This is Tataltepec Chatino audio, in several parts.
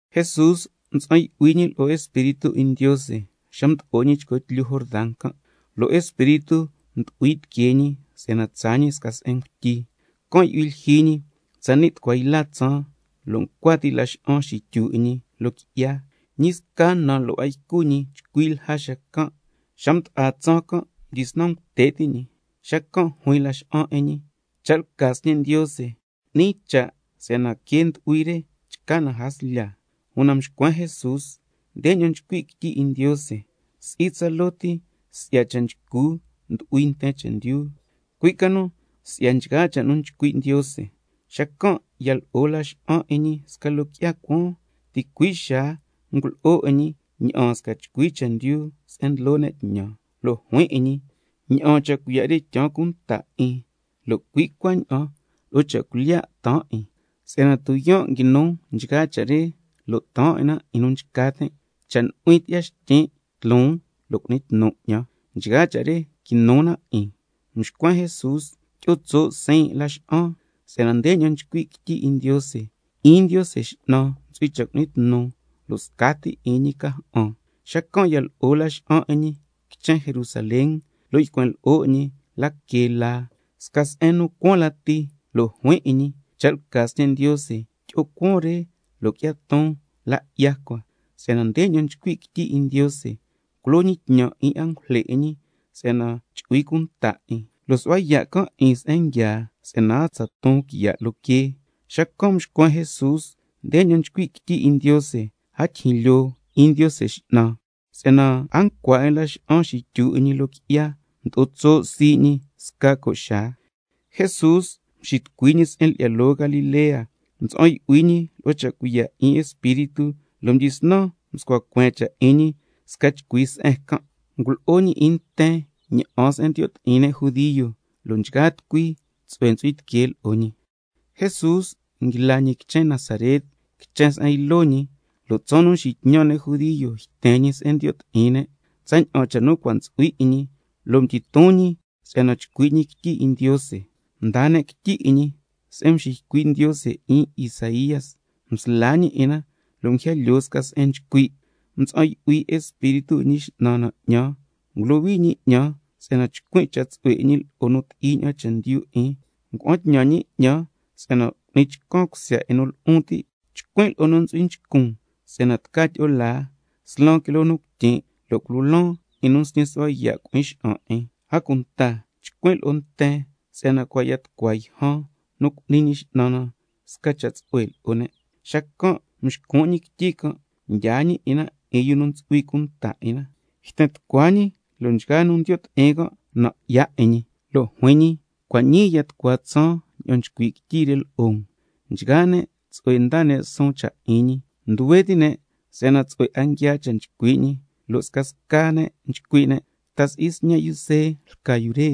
Jesús mtsa'an yu'hui ñi lo'o Espíritu 'in Ndiose xa mdo'o ñi chco tlyu Jordan can', lo' Espíritu mdu'hui tiquee ñi si'yana tsaa ñi sca se'en ngutyi, can' yu'hui lyijyi ñi tsani' tucua yla tsaan, lo' ncua ti' laxa'an xityu 'in ñi loo qui'ya. Ñi sca na lo' a ycu ñi chcui lja xacan', xa mda'a tsaan can' mdyisnan ngute' ti' ñi. Xacan' juin laxa'an 'in ñi: Cha' lca Sñe' Ndiose, cu'ni cha' si'yana quee ndu'hui re chca na jaslya. Una mxcuen Jesús: Ndeña'an nchcui' quityi 'in Ndiose: —Si'i tsaloo ti si'ya cha' nchcu ndyu'hui nten chendyu—, cui' ca nu si'ya nchgaa cha' nu nchcui' Ndiose. Xacan' ya lo'o laxa'an 'in ñi sca loo qui'ya cuaan, ticui' xaa can' ngulo'o 'in ñi ña'aan sca chcui chendyu se'en ndlo ne' tñan, lo' juin 'in ñi: Ña'aan cha' cuiya' re tyaan cunta 'in lo' cui' cuaña'an lo'o cha' cuilyiya' taan 'in, si'yana tuyaan' nguinu nchgaa cha' re, lo' taan 'in na 'in nu nchca tin', cha' nu'huin tyi'ya xtyin' tloon lo' cu'ni tnu 'ñan, nchgaa cha' re quinu na 'in. Mxcuen Jesús: Tyi'o tso' siin' laxa'an, si'yana ndeña'an nchcui' quityi 'in Ndiose: —'In Ndiose X'nan ntsu'hui cha' cu'ni tnu, lo' scati 'in ñi ca ja'an—. Xacan' ya lo'o laxa'an 'in ñi quichen Jerusalén, lo' ycuen lo'o 'in ñi la que laa sca se'en cuaan lati, lo' juin 'in ñi: Cha' lca Sñe' Ndiose, tyi'o cuaan re lo' qui'ya ton la 'ya cua, si'yana ndeña'an nchcui' quityi 'in Ndiose: —Culo ñi tñan 'in angujle 'in ñi si'yana chu'hui cunta 'in, lo' su'hua yaa' can' 'in se'en nguiaa, si'yana a tsa ton quiya' loo quee—. Xacan' mxcuen Jesús: Ndeña'an nchcui' quityi 'in Ndiose: —A tyijyin lyoo 'in Ndiose X'nan—. Si'yana a ncua 'in laxa'an xityu 'in ñi loo qui'ya, mdo'o tso' sii' ñi sca co' xaa. Jesús mxitucui ñi se'en lyi'ya loo Galilea, mtsa'an yu'hui ñi lo'o cha' cuiya' 'in Espíritu, lo' mdyisnan mscua cueen cha' 'in ñi sca chcui se'en can'. Ngulo'o ñi 'in nten na'an se'en ndiyo' ti'in ne', lo' nchgaa tucui tsu'hue ntsu'hui tiquee lo'o ñi. Jesús nguila ñi quichen Nazaret, quichen se'en ylo ñi, lo' tsaan nu nxitñan' ne' judio yten ñi se'en ndiyo' ti'in ne', tsaña'an cha' nu cua' ntsu'hui 'in ñi, lo' mdyiton ñi si'yana chcui' ñi quityi 'in Ndiose, mdaa ne' quityi 'in ñi se'en mxiycui' Ndiose 'in Isaía, msla ñi 'in na lo' nguija lyoo sca se'en nchcui': —Mtsa'an yu'huin lo'o Espíritu 'in Ñi X'nan na, can' cha' ngulohui ñi 'ñan si'yana chcuin' cha' tsu'hue 'in ñi lo'o nu ti'i ña'an chendyu 'in, ngua'an tñan ñi 'ñan si'yana cu'ni chcan cusya 'in nu lu'un ti'. Chcuin' lo'o nu ntsu'hui nchcun si'yana tca tyi'o laa, slan quiloo nu cuityin', lo' culo laan 'in nu nsñi su'hua yaa' cui'in xa'an 'in. A cunta chcuin' lo'o nten si'yana cua' ya tucua yjan nu cu'ni Ñi X'nan na sca cha' tsu'hue lo'o ne'—. Xacan' mxcun' ñi quityi can', mdyaa ñi 'in na 'in yu nu ntsu'hui cunta 'in na, yten tucua ñi lo' nchgaa nu ndiyo' ti'in can' nan' 'ya 'in ñi, lo' juin ñi: Cua' ñii ya tucua tsaan ña'an nchcui' quityi re lo'o um. Nchgaa ne' tsu'hue ndaa ne' suun cha' 'in ñi, nduhue ti' ne' si'yana tsu'hue 'a nguiaa cha' nu nchcui' ñi, lo' scasca ne' nchcui' ne': ¿Ta si'i sñe' yu See lca yu re?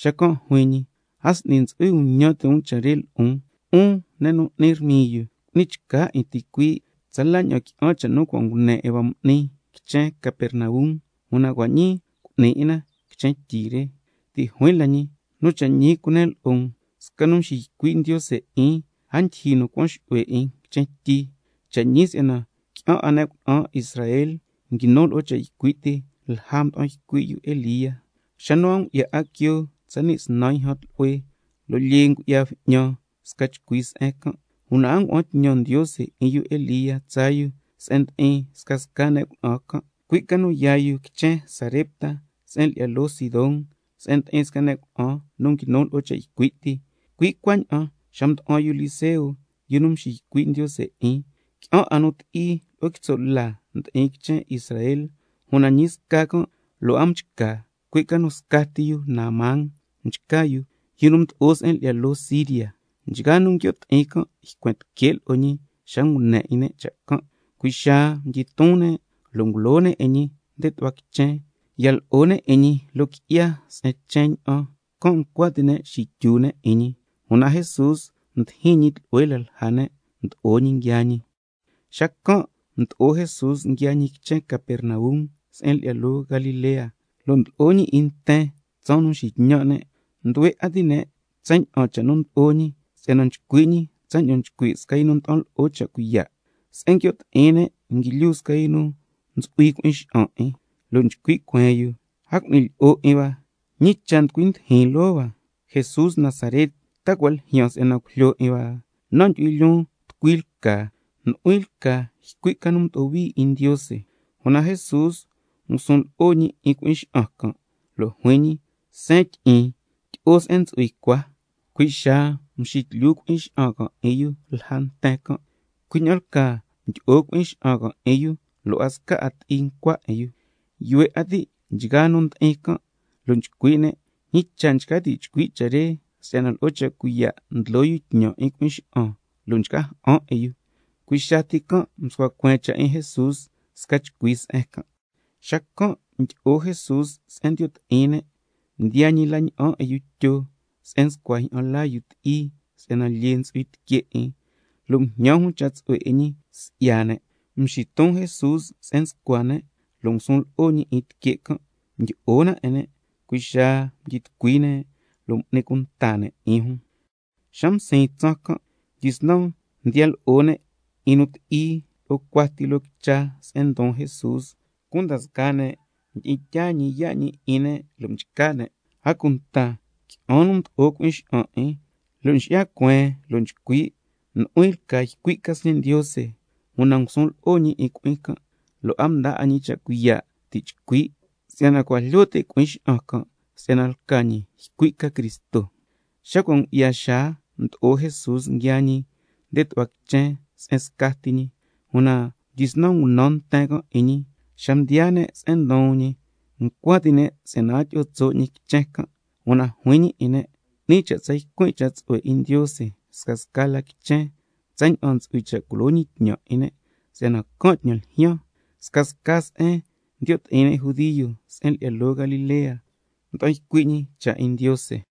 Xacan' juin ñi: A s'ni ntsu'hui nu ñan ti' cha' re lo'on: 'Un ne' nu n'ni rmiyu, cu'ni chca 'in ticuii', tsala ña'an qui'an cha' nu cua' ngune 'in hua m'ni quichen Capernaum, una cua' ñii cu'ni 'in na quichen tyi re. Ti' juin la ñi: Nu cha' ñi cunen lo'o um, sca nu nxiycui' Ndiose 'in, a ndyijyi nu nducuan xu'hue 'in quichen tyi. Cha' ñi si'yana qui'an 'a ne' cuna'an Israel nguinu lo'o cha' ycui' ti lja mda'an ycui' Elía, xa nu a ngu'ya 'a quioo tsani' snan yjan tlu'hue, lo' lyee ngu'ya bju'ñan sca chcui se'en can', una a ngua'an tñan Ndiose 'in yu Elía tsaa yu se'en ndi'in scasca ne' cuna'an can', cui' ca nu yaa yu quichen Sarepta se'en lyi'ya loo Sidón, se'en ndi'in sca ne' cuna'an nu nguinu lo'o cha' ycui' ti. Cui' cuaña'an xa mda'an yu Eliseo, yu nu mxiycui' Ndiose 'in, qui'an 'a nu ti'i lo'o quitso' la ndi'in quichen Israel, una ñi sca can' lo' a mchca, cui' ca nu scati yu Naamán mchca yu, yu nu mdo'o se'en lyi'ya loo Siria. Nchgaa nu nguio' ti'in can' ycuen tique' lo'o ñi xa ngune 'in ne' cha' can', cui' xaa mdyiton ne' lo' ngulo ne' 'in ñi nde tu'hua quichen, ya lo'o ne' 'in ñi loo qui'ya se'en chen ña'an, can' ncua ti' ne' xityu ne' 'in ñi. Una Jesús mdijin ñi tlu'hue la lja ne', mdo'o ñi nguiaa ñi. Xacan' mdo'o Jesús nguiaa ñi quichen Capernaum se'en lyi'ya loo Galilea, lo' ndlo'o ñi 'in nten tsaan nu nxitñan' ne'. Nduhue 'a ti' ne' tsaña'an cha' nu ndlo'o ñi si'yana nchcui' ñi tsaña'an nchcui' sca nu nda'an lo'o cha' cuiya'. Se'en nguio' ti'in ne' nguilyu sca yu nu ntsu'hui cui'in xa'an 'in, lo' nchcui' cueen yu: ¡A cu'ni lyi'o 'in hua! ¿Ñi cha' nducui ndijin loo hua, Jesús Nazaret? ¿Ta cua' ljyaan si'yana cujlyo 'in hua? Nan' ndyu'huin lyoon tucui lca, nu'huin lca ycui' ca nu mdo'o hui 'in Ndiose. Una Jesús ngusun lo'o ñi 'in cui'in xa'an can', lo' juin ñi: Seen tyi'in, tyi'o se'en ntsu'hui cua. Cui' xaa mxitlyu cui'in xa'an can' 'in yu lja nten can', cui' ña'an lcaa mdyi'o cui'in xa'an can' 'in yu lo' a sca ti'i ncua 'in yu. Yuhue 'a ti' nchgaa nu ndi'in can', lo' nchcui' ne': ¿Ñi cha' nchca ti' chcui' cha' re si'yana lo'o cha' cuiya' ndlo yu tñan 'in cui'in xa'an, lo' nchca ja'an 'in yu? Cui' xaa ti can' mscua cueen cha' 'in Jesús sca chcui se'en can'. Xacan' mdyi'o Jesús se'en ndiyo' ti'in ne', mdiyaa ñi la na'an 'in yu Tyo se'en nscua jyi'an laa yu ti'i si'yana lyee ndu'hui tique' 'in, lo' mjñan jun cha' tsu'hue 'in ñi si'ya ne'. Mxiton Jesús se'en nscua ne' lo' ngusun lo'o ñi 'in tique' can', mdyi'o na 'in ne', cui' xaa mdyi tucui ne' lo' m'ni cunta ne' 'in jun. Xa msiin tsaan can' mdyisnan mdiya lo'o ne' 'in nu ti'i lo'o cuati loo quicha se'en ndon Jesús, cunda scaa ne' mdi'in tyaa ñi yaa' ñi 'in ne' lo' mchca ne'. A cunta qui'an nu mdo'o cui'in xa'an 'in, lo' nxi'ya cueen lo' nchcui': Nu'huin lca ycui' ca Sñe' Ndiose. Una ngusun lo'o ñi 'in cui'in can' lo' a mdaa 'a ñi cha' cuiya' ti' chcui', si'yana cua' jlyo ti' cui'in xa'an can' si'yana lca ñi ycui' ca Cristo. Xa cua' ngu'ya xaa mdo'o Jesús nguiaa ñi nde tu'hua quichen se'en scati ñi, una mdyisnan ngunan nten can' 'in ñi, xa mdiyaa ne' se'en ndon ñi ncua ti' ne' si'yana a tyi'o tso' ñi quichen can', una juin ñi 'in ne': 'Ni cha' tsa ycuin' cha' tsu'hue 'in Ndiose scasca la quichen tsaña'an ntsu'hui cha' culo ñi tñan 'in ne', si'yana can' tñan ljyaan. Scasca se'en ndiyo' ti'in ne' judio se'en lyi'ya loo Galilea, mda'an ycui' ñi cha' 'in Ndiose.